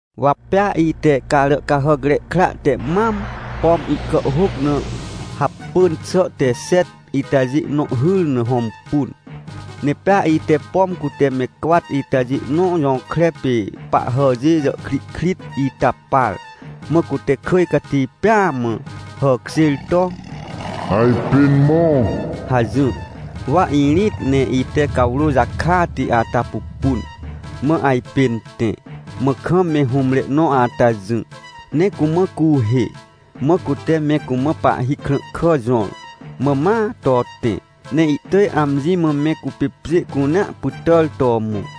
Wa pea ite Caràcahàcre Kra te mam, pom ihkàhhôc na hapỳn xà te xet itajê nõ hyr na hõmpun, ne pea ite, pom cute me cwat itajê nõ jõkre pê pahhàjê jàhkrihkrit ita par, mã cute kỳj cati pêa mã hàkjêr to: — Ajpên mõ! — hajỹr. Wa irĩt, ne ite cawrô jakati ata pupun, mã ajpên tẽ. Mã kam me hũmre nõ ata jỹ, ne cumã cuuhê, mã cute me cumã pahhi krãhkà jõr. Mã ma to tẽ ne ihtỳj amji mã me cupê pjê cunea pytàr to mõ.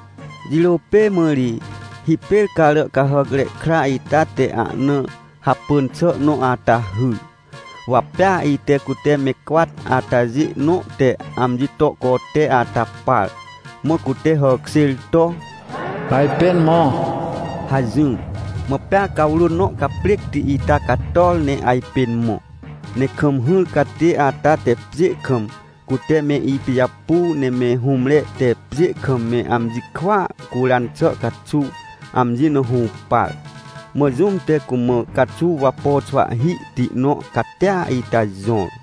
Jirô pê mã ri, hipêr Caràcahàcre Kra ita te ahna hapỳn xà nõ ata hyr. Wa pea ite cute me cwat atajê nõ te amji to cote ata par, mã cute hàkjêr to: — Ajpên mõ! — hajỹr. Mã pea cawrô nõ caprêcti ita cator ne ajpên mõ. Ne kam hỹr catê ata te pjê kam, cute me ipijapu ne me hũmre te pjê kam me amji kwỳa curan xà caxuw, amji na hũpar. Mã jũm te cumã caxuw wapo xwahhihti nõ catia ita jõr.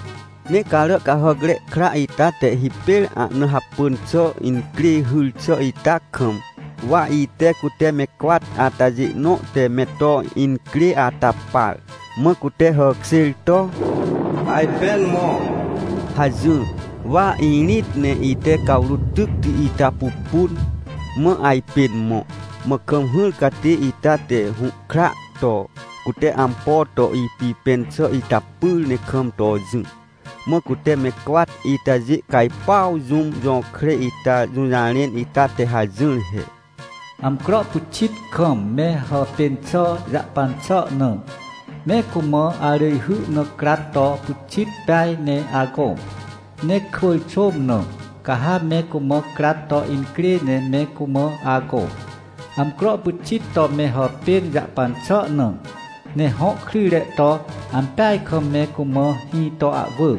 Ne Caràcahàcre Kra ita te hipêr ahna hapỳn xà incrê hyr xà ita kam, wa ite cute me cwat atajê nõ te me to incrê ata par, mã cute hàkjêr to: — Ajpên mõ! — hajỹr. Wa irĩt ne ite cawrô tycti ita pupun, mã ajpên mõ. Mã kam hỹr catê ita te hũhkra to cute ampo to ipipẽn xà ita pyr ne kam to jỹ. Mã cute me cwat itajê cajpuaw jũm jõkre ita jũjarẽn ita te hajỹr he: — Amcro pyxit kam me hàpên xà jahpan xà na, me cumã arỳjhy na crat to pyxit peaj ne agõ. Ne kwỳr xôm na, ca ha me cumã crat to incrê ne me cumã agõ, amcro pyxit to me hàpên jahpan xà na. Ne hõ kryjre to ampeaj kam me cumã hĩ to ahwỳ.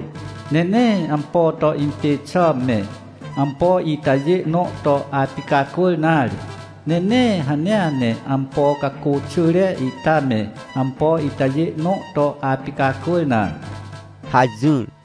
Ne nee ampo to impê xà me, ampo itajê nõ to apicacwỳr nare, ne nee hanea ne ampo cacô xỳre ita me ampo itajê nõ to apicacwỳr nare — hajỹr.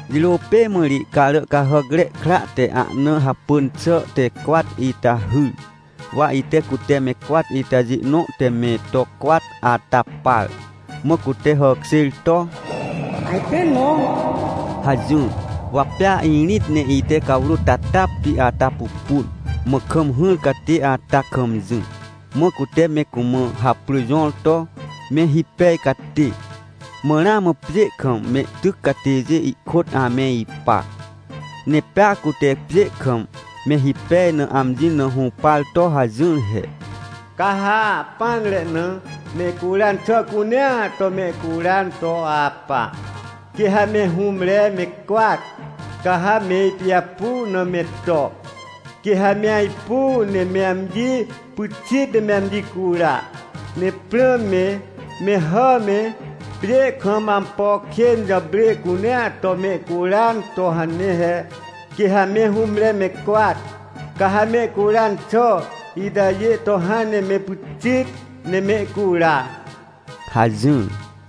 Jirô pê mã ri Caràcahàcre Kra te ahna hapỳn xà te cwat ita hyr. Wa ite cute me cwat itajê nõ te me to cwat ata par, mã cute hàkjêr to: — Ajpên mõ! — hajỹr. Wa pea irĩt ne ite cawrô tatapti ata pupun, mã kam hỹr catê ata kam jỹ, mã cute me cumã haprỳ jõr to Me Hipej Catê. Mã ramã pjê kam mehtyc catêjê ihkôt ame ipa. Ne pea cute pjê kam me hipej na amji na hũpar to hajỹr he: — Ca ha ahpỹanre na mehcuran xà cunea to mehcuran to apa. Quê ha me hũmre me cwat, ca ha me ipijapu na me to, quê ha me ajpu ne me amji pyxit ne me amji cura. Ne prãm me, me hà me, pjê kam ampo kên jàprê cunea to mehcuran to hane he. Quê ha me hũmre me cwat, ca ha mehcuran xà itajê to hãn ne me pyxit ne mehcura — hajỹr.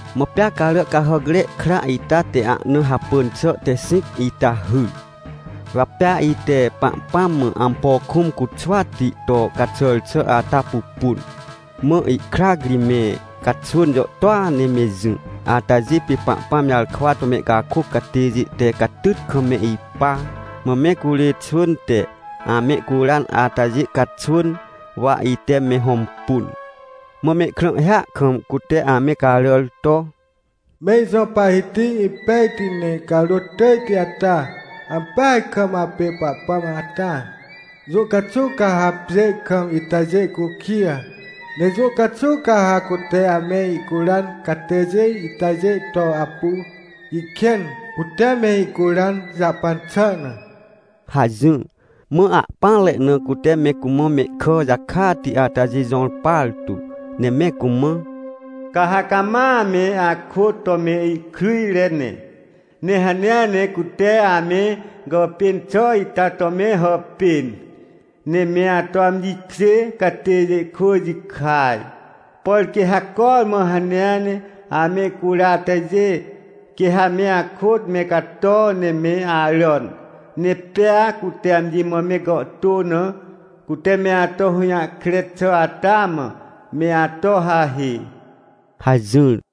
Mã pea Caràcahàcre Kra ita te ahna hapỳn xà te xĩc ita hyr. Wa pea ite Pahpãm mã ampo kũm cuxwati to caxàr xà ata pupun. Mã ihkrac ri me caxwỳn jàhtôa ne me jỹ, atajê pê Pahpãm jarkwa to mehcakôc catêjê te catyt kam me ipa, mã me curê xwỳn te amehcuran atajê caxwỳn, wa ite me hõmpun. Mã mehkrãhhia kam cute ame caràr to: — Me ijõ Pahhiti impejti ne carôt tỳjti ata! Ampeaj kam apê Pahpãm ata! Jũ caxuw ca ha pjê kam itajê cukij? Ne jũ caxuw ca ha cute ame icuran catêjê itajê to apu ihkên, cute me icuran jahpan xà na? — hajỹr. Mã ahpỹanre na cute me cumã mehkà jakati atajê jõr partu, ne me cumã: — Ca ha cama ame akôt to mehkryjre ne. Ne hanea ne cute ame gàpên xà ita to me hàpên, ne me ato amji kjê catêjê kwỳ jikaj. Por quê ha cormã hanea ne amehcura atajê, quê ha me akôt me cato ne me aràn. Ne pea cute amji mã me gàhtô na, cute me ato hũjahkre xà ata mã, me ato hahê — hajỹr.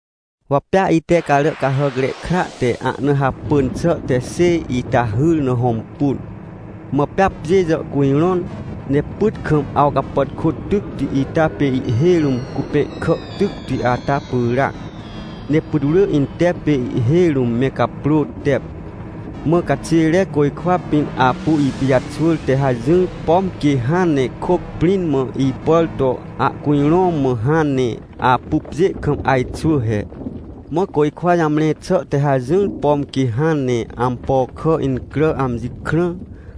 Wa pea ite Caràcahàcre Kra te ahna hapỳn xà te xêj ita hyr na hõmpun. Mã pea pjê jàhcujrõn, ne pyt kam awcapàtkô tycti ita pê ihhêj rũm cupẽhkà tycti ata pyràac, ne putwrỳ intep pê ihhêj rũm me caprô tep. Mã caxêre côjkwa pĩn apu ipijaxwỳr te hajỹr, pom quê hãn ne kôc prĩn mã ipàr to ahcujrõ, mã hãn ne apu pjê kam ajxwỳ he. Mã côjkwa jamre xà te hajỹr, pom quê hãn ne ampo kà incrà amji krã,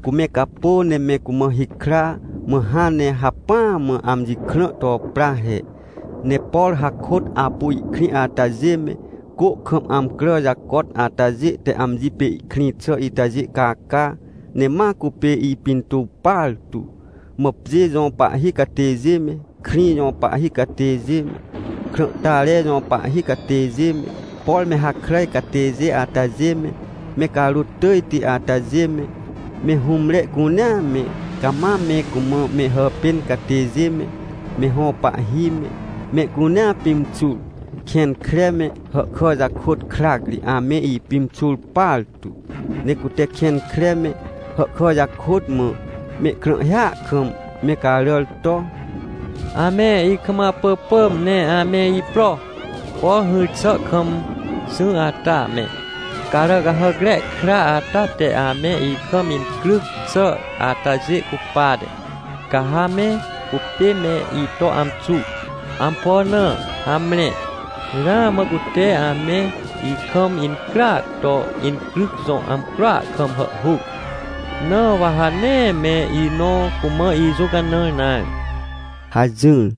cu me capô ne me cumã hikra, mã hãn ne hacpỹa mã amji krã to pra he. Ne por hakôt apu ihkrĩ atajê me, cô kam amcrà jacot atajê te amji pê ihkrĩ xà itajê caca, ne ma cupê ipintuw partu. Mã pjê jõ pahhi catêjê me, krĩ jõ pahhi catêjê me, krãhtare jõ pahhi catêjê me, por me hakràj catêjê atajê me, me carôt tỳjti atajê me, me hũmre cunea me, cama me cumã me hàpên catêjê me, me hõ pahhi me, mehcunea pimxur, kẽn kre me hàhkà jakôt krac ri ame ipimxur partu. Ne cute kẽn kre me, hàhkà jakôt mã mehkrãhhia kam me caràr to: — Ame ikam apỳpỳm ne ame ipro, por hỹr xà kam jỹ ata me, Caràcahàcre Kra ata te ame ikam incryc xà atajê cupate, ca ha me cupê me ito amxu. Ampo na? Hamre, ramã cute ame ikam incryac to incryc jõ amcroa kam hàhhuc, na wa ha nee me inõ cumã ijũcanãr nare — hajỹr.